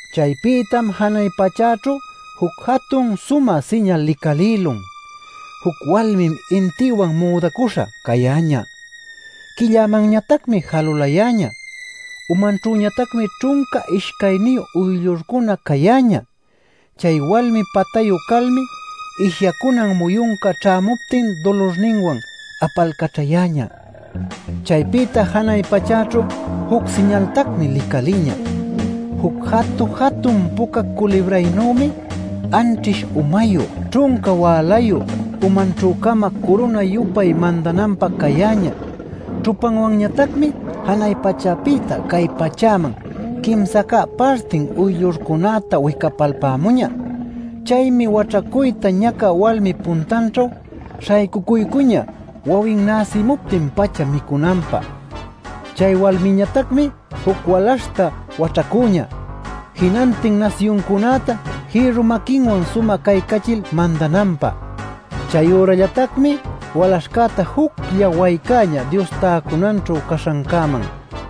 Chaypïtam janay pachächu juc jatun sumä siñal licalïlun: juc walmim intïwan müdacuśha cayäñä; quillämanñatacmi jalulayäñä; umanćhüñatacmi ćhunca ishcayniyu uyllurcuna cayäñä. Chay walmi patayu calmi ishyacunan muyunca ćhämuptin dulurninwan apalcaćhayäñä. Chaypïta janay pachäćhu juc siñaltacmi licalïñä: juc jatu-jatun puca culibraynuymi anćhish umayu, ćhunca wälayu, umanćhü-cama curuna-yupay mandananpä cayäñä. Ćhupanwanñatacmi janay pachäpïta cay pachäman quimsa cä partin uyllurcunäta wicapalpämuñä. Chaymi waćhacuyta ñacä walmip puntanćhu śhaycucuycuñä wawin näsimuptin-pacha micünanpä. Chay walmïñatacmi juc walaśhta waćhacüñä, jinantin nasyuncunäta jïrru maquinwan sumä caycachil mandananpä. Chayürallatacmi walaśhcäta juclla waycäñä Dios täcunanćhu caśhancäman.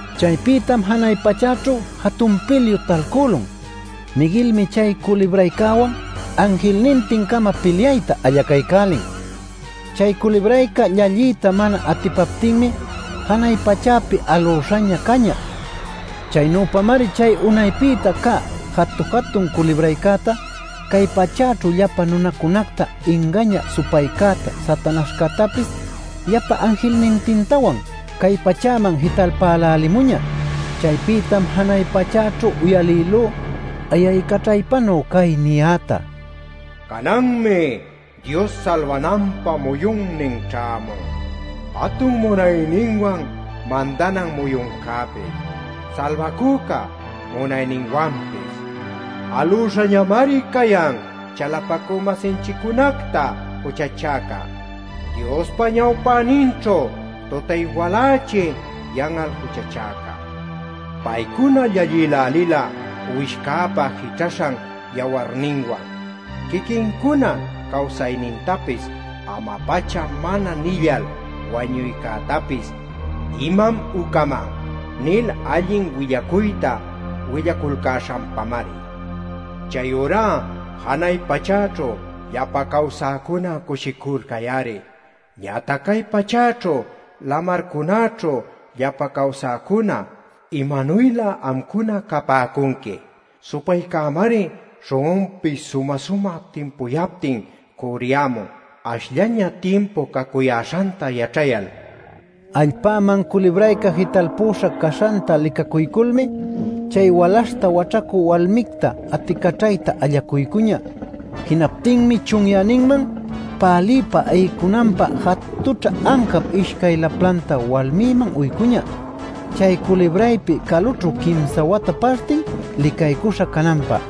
Chaypïtam janay pachäćhu jatun pilyu talcülun: Miguelmi chay culibraycäwan anjilnintin-cama pilyayta allacaycälin. Chay culibrayca llalliyta mana atipaptinmi janay pachäpi alüśhaña cañä. Chaynüpamari chay unaypïta cä jatu-jatun culibraycäta, cay pachäćhu llapa nunacunacta ingañä supaycäta, Satanaśhcätapis llapa anjilnintintawan cay pachäman jitalpälälimuñä. Chaypïtam janay pachäćhu uyalïlú ayaycaćhaypanuy cay niyäta: “Cananmi Dios salbananpä muyunnin ćhämun, jatun munayninwan mandanan muyuncäpis, Salbacüca munayninwanpis. Alüśhañamari cayan chalapacü-masinchiccunacta juchachäca, Diospa ñawpäninćhu tutay-walächi yan'al juchachäca. Paycuna llallïlälila Uwishcäpa jićhaśhan yawarninwan, quiquincuna cawsaynintapis ama-pacha mana nillal, wañuycätapis ‘imam ucaman’ nil allin willacuyta willaculcäśhanpamari. Chayurá janay pachäćhu llapa cawsäcuna cushiculcay-ari. Ñatac cay pachäćhu lamarcunäćhu llapa cawsäcuna ¡imanuylä amcuna capäcunqui! Supaycämari śhun'unpis sumä-sumä timpuyaptin cürriyämun, ashllaña timpu cacuyäśhanta yaćhayal” nil. Allpäman culibrayca jitalpüśha caśhanta licacuyculmi chay walaśhta waćhacü walmicta aticaćhayta allacuycuñä. Jinaptinmi chunyäninman päliypa ayicunanpä jatućhä ancap ishcay laplanta walmiman uycüña chay culibraypi calućhu quimsa wata partin licaycuśha cananpä.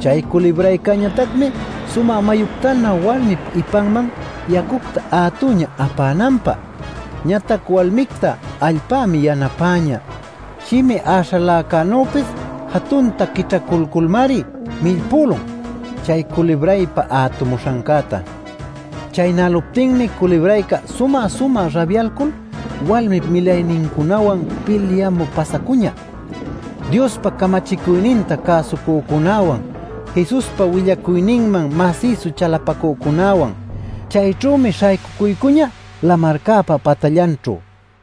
Chay culibraycäñatacmi sumä mayuctanuy walmip ipanman yacucta ätüñä apänanpä. Ñatac walmicta allpämi yanapäñä; shimi äśhaläcänüpis jatunta quićhacuyculmari millpülun chay culibraypa ätumuśhancäta. Chaynäluptinmi culibrayca sumä-sumä rabyalcul walmip milaynincunawan pilyamü pasacuñä: Diospa camachicuyninta cäsucücunäwan, Jesuspa willacuyninman masïsu chalapacücunäwan. Chayćhümi śhaycucuycuñä lamarcäpa patallanćhu.